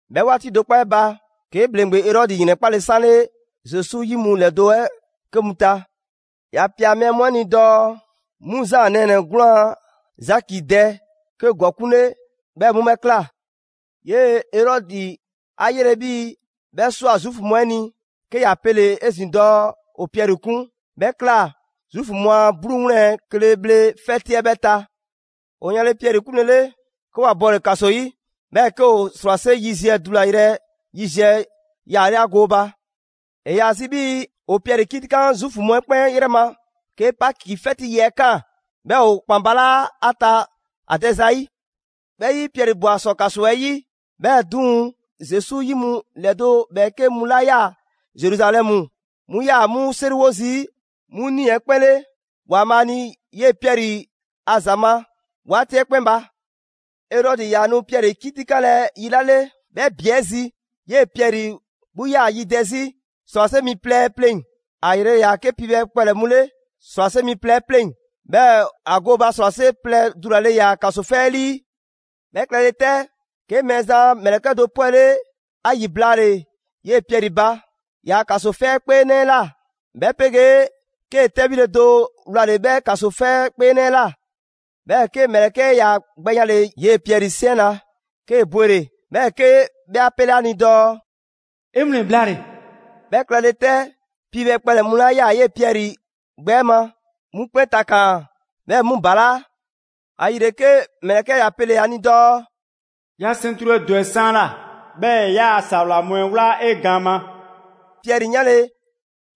'Bhɛ 'waati do 'kpɔ 'ɛ ba, 'ke ‑bhleŋgbe Erɔdi ‑yrɛnkpale 'sanle Zesu 'yi mu ‑lɛdo' 'ɛ 'ke mu ta. ‑Ya ꞊pia mɛɛ mu 'ɛ ni dɔɔ 'mu Zaan nɛɛnɛ‑ 'gwlaan‑ Zaki dɛ 'ke ‑gɔkuŋ' 'le, 'bhɛɛ‑ 'mu 'bhɛ ꞊kla. 'Yee‑ Erɔdi 'a 'yele 'bhii‑ 'bhɛ ꞊swa Zuufu mu 'ɛ ni, 'ke ‑ya pele‑ 'ezin‑ dɔɔ ‑o Piɛri 'kun. 'Bhɛ ꞊kla Zuufu mu a 'bluu 'wlɛn‑ kle bhle 'fɛti 'ɛ 'bhɛɛ‑ ta. ‑O yanle Piɛri 'kunlele, 'ke ‑wa bɔle‑ ‑kaso 'yi. 'Bhɛɛ‑ 'ke ‑o ‑srwase' yiziɛ dulayrɛ yiziɛ yaale' ‑a gooba. ‑E ‑yaa zi 'bhii‑ ‑o Piɛri 'kitikan Zuufu mu 'ɛ 'kpɛn 'yrɛ ma 'ke Paki 'fɛti yi 'ɛ ꞊kaan, 'bhɛɛ‑ ‑o ‑kpan balaa' ‑a ta ‑a dɛ zayi'. 'Bhɛ 'yi, Piɛri ꞊bwa ‑sɔ ‑kaso 'ɛ 'yi; 'Bhɛɛ‑ 'duŋ‑, Zesu 'yi mu ‑lɛdo' ‑bhɛɛke' mu 'la ꞊yaa Zeruzalɛmu 'mu꞊yaa 'mu 'seriwo zii' 'mu nii‑ 'ɛ 'kpɛn 'le ‑Waanbhaa' ni 'yee‑ Piɛri a ‑za ma 'waati 'ɛ 'kpɛn ba. Erɔdi ‑yaa nu Piɛri 'kitikanlɛ yi 'la 'le, 'bhɛ ‑bi 'ɛ zi 'yee‑ Piɛri 'gbu 'yaa‑ yidɛ 'zi ‑srwase' mi plɛ pleŋ‑. ‑A ‑yrele' ‑yaa 'ke piibhɛ kpɛlɛ‑ mu 'le ‑srwase' mi plɛ 'ɛ pleŋ‑, 'bhɛɛ‑ ‑a gooba ‑srwase' plɛ dulale ‑yaa ‑kaso 'fɛ 'ɛ 'lii. 'Bhɛ klɛle 'tɛ, 'ke Mɛɛzan a ‑mlɛkɛ' do 'pwɛle ‑a ‑yi blaale‑ 'yee‑ Piɛri ba ‑yaa' ‑kaso 'fɛkpeenɛ 'ɛ ꞊la, 'bhɛ 'pegee 'ke 'tɛbhile do wlale‑ 'bhɛ ‑kaso 'fɛkpeenɛ 'ɛ ꞊la. 'Bhɛɛ‑ 'ke ‑mlɛkɛ' 'ɛ ‑ya gbɛ yanle 'yee‑ Piɛri 'siɛn na, 'kee‑ bwele‑. 'Bhɛɛ‑ 'ke 'bhɛ 'a 'pele 'a ni dɔɔ: «'E 'wlɛn‑ blaale‑!» 'Bhɛ klɛle 'tɛ, piibhɛ kpɛlɛ‑ mu 'la ꞊yaa 'yee‑ Piɛri gbɛ ma 'mu 'kpɛn takaan‑, 'bhɛɛ‑ 'mu ‑balaa'. ‑Ayile 'ke ‑mlɛkɛ' ‑ya pele‑ ‑a ni dɔɔ: «'Yaa‑ 'sɛntru 'ɛ dɔ 'e 'saanla, 'bhɛɛ‑ 'yaa‑ ‑sawla mu 'ɛ 'wla 'e gaan ma.» Piɛri 'yanle‑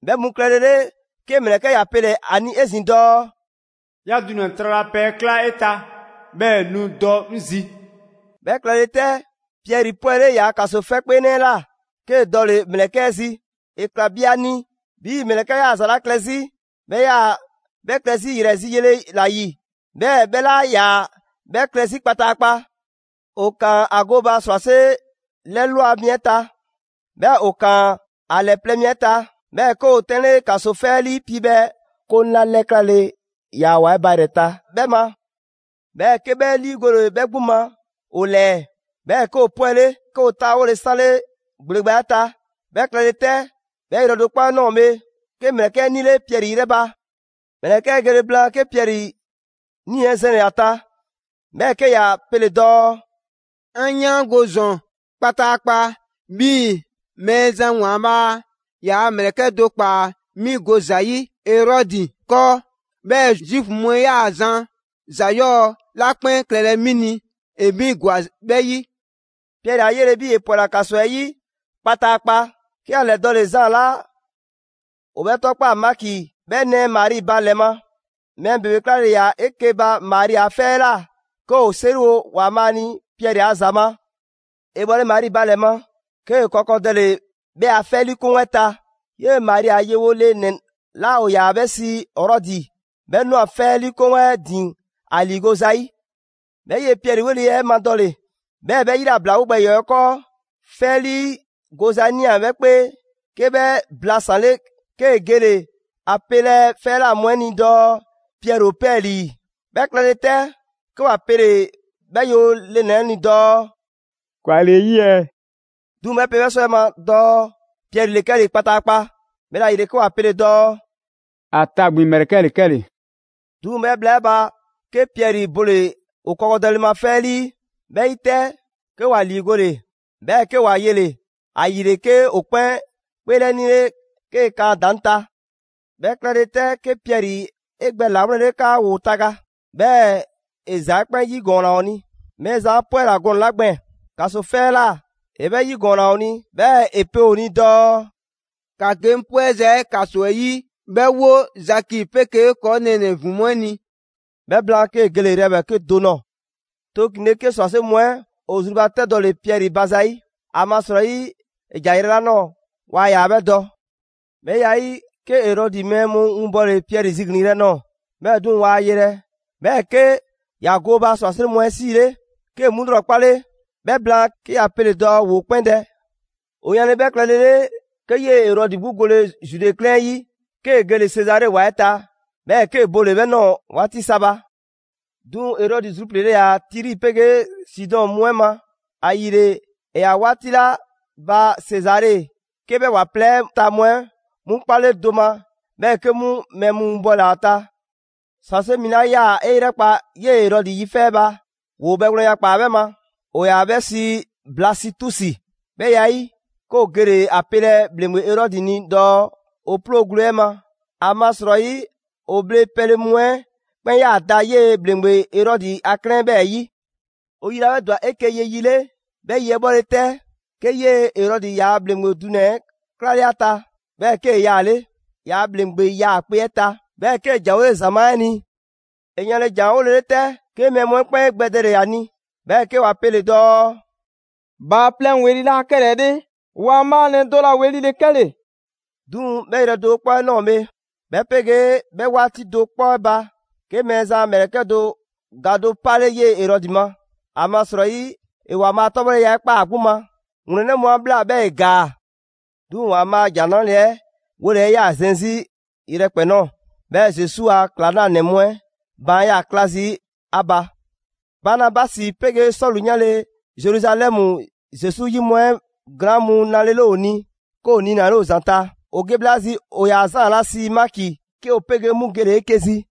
'bhɛ mu klɛlele, 'ke ‑mlɛkɛ' ‑ya pele‑ ‑a ni 'ezin‑ dɔɔ: «'Yaa‑ dunɛ‑ tralapɛ 'ɛ ꞊kla 'e ta, 'bhɛɛ‑ nu dɔ 'ŋ zi.» 'Bhɛ klɛle 'tɛ, Piɛri 'pwɛle ‑yaa' ‑kaso 'fɛkpeenɛ 'ɛ ꞊la, 'kee‑ dɔle‑ ‑mlɛkɛ' 'ɛ zi. ‑E ꞊kla bi ‑a ni 'bhii‑ ‑mlɛkɛ' 'yaa‑ ‑za 'la klɛ 'zi 'bhɛ 'yaa‑ 'bhɛ klɛ 'zi ‑yrɛ zi yele ‑la ‑yi, 'bhɛɛ‑ 'bhɛ 'laa ‑yaa 'bhɛ klɛ 'zi kpataakpa. ‑O ‑kaan ‑a gooba ‑srwase' 'lɛ ꞊lwa mi 'ɛ ta, 'bhɛɛ‑ ‑o ‑kaan ‑a ‑lɛ plɛ mi 'ɛ ta; 'bhɛɛ‑ 'ke ‑o 'tɛnle ‑kaso 'fɛ 'ɛ 'lii piibhɛ 'koŋ 'la 'lɛklale ‑yaa ‑wa 'ɛ ba ‑yrɛ ta 'bhɛ ma. 'Bhɛɛ‑ 'ke 'bhɛ 'liigole 'bhɛ 'gbu ma ‑o ‑lɛɛ. 'Bhɛɛ‑ 'ke ‑o 'pwɛle, 'ke ‑o 'taawole 'sanle ‑gbleba 'ɛ ta. 'Bhɛ klɛle 'tɛ, 'bhɛ yrɛ do 'kpɔ 'ɛ ꞊nɔɔ bhe, 'ke ‑mlɛkɛ' 'ɛ 'nile Piɛri 'yrɛ ba. ‑Mlɛkɛ' 'ɛ gele blaan', 'ke Piɛri nii‑ 'ɛ zɛnle‑ ‑a ta, 'bhɛɛ‑ 'ke ‑ya pele‑ dɔɔ: «'An 'yaango ‑zɔn kpataakpa 'bhii‑ Mɛɛzan ‑Waanbhaa' ‑yaa' ‑mlɛkɛ' do ꞊kpaa 'mi go zayi' Erɔdi 'kɔɔ, 'bhɛɛ‑ Zuufu mu 'ɛ 'yaa‑ zan ‑za 'yɔɔ‑ 'la 'kpɛn klɛlɛ 'mi ni, ‑e 'mi ‑gwa 'bhɛ 'yi.» Piɛri 'a 'yele‑ 'bhii‑ ‑e ‑pwɛla ‑kaso 'ɛ 'yi kpataakpa, 'ke ‑ya ‑lɛdɔɔle Zaan 'la ‑o 'bhɛ 'tɔkpaa‑ Maki 'bhɛ nɛɛ Mari ba ‑lɛ ma. Mɛɛ ‑bebe 'klale‑ ‑yaa 'eke‑ ba Mari a 'fɛ 'ɛ ꞊la 'ke ‑woo 'seriwo ‑Waanbhaa' ni 'yee‑ Piɛri a ‑za ma. ‑E bhɔle Mari ba ‑lɛ ma, 'kee‑ kɔkɔdɛle 'bhɛ a 'fɛlii 'koŋ 'ɛ ta. 'Yee‑ Mari a yewo le ‑nɛ 'la ‑o ‑yaa 'bhɛ sii Rɔdi, 'bhɛ ꞊nwa 'fɛ 'liikoŋ 'ɛ ‑din ‑a ‑liigo' zayi'. 'Bhɛ 'yee‑ Piɛri 'weli‑ 'ɛ madɔle, 'bhɛɛ‑ 'bhɛ ‑yilablawo gbɛ ‑yɔɔ 'ɛ 'kɔɔ, 'fɛ 'ɛ 'lii goza ꞊nia 'bhɛ 'kpee. 'Ke 'bhɛ blasanle, 'kee‑ gele‑ ‑a pelɛ 'fɛ 'ɛ ꞊la mu 'ɛ ni dɔɔ Piɛri ‑o 'pɛɛlii‑. 'Bhɛ klɛle 'tɛ, 'ke ‑wa pele‑ 'bhɛ yewo le ‑nɛ 'ɛ ni dɔɔ: «‑Kwa ‑le 'e 'yi ɛɛ?» 'Duŋ‑ 'bhɛ pe 'bhɛ 'sɔwɛɛ‑ 'ɛ ma dɔɔ Piɛri ‑le 'kɛle‑ kpataakpa. 'Bhɛla‑ ‑yile 'ke ‑wa pele‑ dɔɔ: «‑A tagbin ‑mlɛkɛ' ‑le 'kɛle‑.» 'Duŋ‑ 'bhɛ bhla 'ɛ ba, 'ke Piɛri bole ‑o kɔkɔdɛle 'ɛ ma 'fɛ 'ɛ 'lii. 'Bhɛ 'yi 'tɛ, 'ke ‑wa ‑liigole, 'bhɛɛ‑ 'ke ‑wa yele‑. ‑Ayile 'ke ‑o 'kpɛn 'kpeelɛnile 'kee‑ kan ‑a ‑daŋ' ta. 'Bhɛ klɛle 'tɛ, 'ke Piɛri 'e gbɛ ‑lawlɛnle 'kaa ‑woo taga; 'bhɛɛ‑ ‑e ‑za 'ɛ 'kpɛn 'yigɔɔnna ‑o ni. Mɛɛzan 'a 'pwɛla‑ gɔnɛ‑ 'la gbɛɛn‑ ‑kaso 'fɛ 'ɛ ꞊la, ‑e 'bhɛ 'yigɔɔnna ‑o ni. 'Bhɛɛ‑ ‑e pe ‑o ni dɔɔ: «‑Ka ge 'ŋ 'pwɛza‑ 'ɛ ‑kaso 'ɛ 'yi, 'bhɛ 'wo Zaki 'pegee ‑kɔɔ' nɛɛnɛ‑ ‑vin mu 'ɛ ni.» 'Bhɛ blaan, 'kee‑ gele‑ yrɛ ‑bhɛɛke' do nɔɔ‑. Tooklinle, 'ke ‑srwase' mu 'ɛ ‑o zrubatɛdɔle Piɛri ba zayi'. ‑Amasrɔyi ‑e ‑ja yrɛ 'la ꞊nɔɔ, waa ‑yaa 'bhɛ dɔ. 'Bhɛ ya 'ɛ 'yi, 'ke Erɔdi mɛɛ mu winbɔle Piɛri ziglin‑ yrɛ nɔɔ‑. 'Bhɛɛ‑ 'duŋ‑, waa ‑a yelɛ. 'Bhɛɛ‑ 'ke ‑ya gooba ‑srwase' mu 'ɛ 'siile 'kee‑ 'mu 'lrɔkpale. 'Bhɛ blaan, 'ke ‑ya pele‑ dɔɔ ‑woo 'kpɛn dɛ. ‑O yanle 'bhɛ klɛle 'le, 'ke 'yee‑ Erɔdi 'gbu gole‑ Zude 'klɛɛn 'ɛ 'yi, 'kee‑ gele‑ Sezare ‑wa 'ɛ ta; 'bhɛɛ‑ 'kee‑ bole‑ 'bhɛ ꞊nɔɔ 'waati sa ba. 'Duŋ‑ Erɔdi zrupliile ‑yaa Tiri 'pegee Sidɔn mu 'ɛ ma. ‑Ayile, ‑e ‑yaa 'waati 'la ba Sezare 'ke 'bhɛ ‑wa plɛ 'ɛ ta mu 'ɛ 'mu 'a 'kpale do ma, 'bhɛɛ‑ 'ke 'mu mɛɛ mu winbɔle ‑a ta. ‑Srwase' mi 'la 'yaa‑ 'e 'yrɛkpa 'yee‑ Erɔdi 'yi 'fɛ 'ɛ ba, ‑woo bhɛgwlɛnya ꞊kpaa 'bhɛ ma. ‑O ‑yaa 'bhɛ sii Blasitusi. 'Bhɛ ya 'ɛ 'yi, 'ke ‑o gele‑ ‑a pelɛ ‑bhleŋgbe Erɔdi ni dɔɔ ‑o 'ploo‑ gwle 'ɛ ma. ‑Amasrɔyi ‑o bhle pɛle mu 'ɛ 'kpɛn ꞊yaa da 'yee‑ ‑bhleŋgbe Erɔdi a 'klɛɛn 'ɛ 'bhɛɛ‑ 'yi. ‑O yi 'la 'bhɛ ‑dwa 'eke‑ ye yi 'le, 'bhɛ yi 'ɛ 'bhɔle‑ 'tɛ, 'ke 'yee‑ Erɔdi ‑yaa' ‑bhleŋgbe dunɛ‑ 'ɛ 'klale ‑a ta; 'bhɛɛ‑ 'kee‑ yaale' ‑yaa' ‑bhleŋgbe 'yaakpe‑ 'ɛ ta. 'Bhɛɛ‑ 'kee‑ ‑janwole ‑zamaa' 'ɛ ni. ‑E yanle ‑janwolele 'tɛ, 'ke mɛɛ mu 'ɛ 'kpɛn 'e gbɛdɛle ‑a ni, 'bhɛɛ‑ 'ke ‑wa pele‑ dɔɔ: «Bhaaplɛŋ ‑weli' laa 'kɛlɛɛ‑ 'le, ‑waanbhaanɛ do ‑la ‑weli' ‑le 'kɛle‑!» 'Duŋ‑ 'bhɛ yrɛ do 'kpɔ 'ɛ ꞊nɔɔ bhe, 'bhɛ 'pegee 'bhɛ 'waati do 'kpɔ 'ɛ ba, 'ke Mɛɛzan a ‑mlɛkɛ' do ga do 'kpale 'yee‑ Erɔdi ma. ‑Amasrɔyi ‑e ‑Waanbhaa' a 'tɔbhɔleya 'ɛ ꞊kpaa ‑a 'gbu ma. ‑Wlɛnnɛ' mu 'a ꞊bhla, 'bhɛɛ‑ ‑e ‑gaa. 'Duŋ‑ ‑Waanbhaa' a ‑Jan 'Nrale‑ 'ɛ 'wole 'ɛ 'yaa‑ zɛn 'zi yrɛkpɛn‑ ꞊nɔɔ. 'Bhɛɛ‑ Zesu a ‑klaŋlanɛ mu 'ɛ baan' 'yaa‑ 'kla zii' ‑a ba. Banabasi 'pegee Sɔlu 'yanle‑ Zeruzalɛmu Zesu 'yi mu 'ɛ glaan' mu 'nalele ‑o ni, 'ke ‑o niinale ‑o ‑zanta'. ‑O ge bhla 'ɛ zi, ‑o ‑yaa Zaan 'la sii Maki 'ke ‑o 'pegee 'mu gele‑ 'eke‑ zi.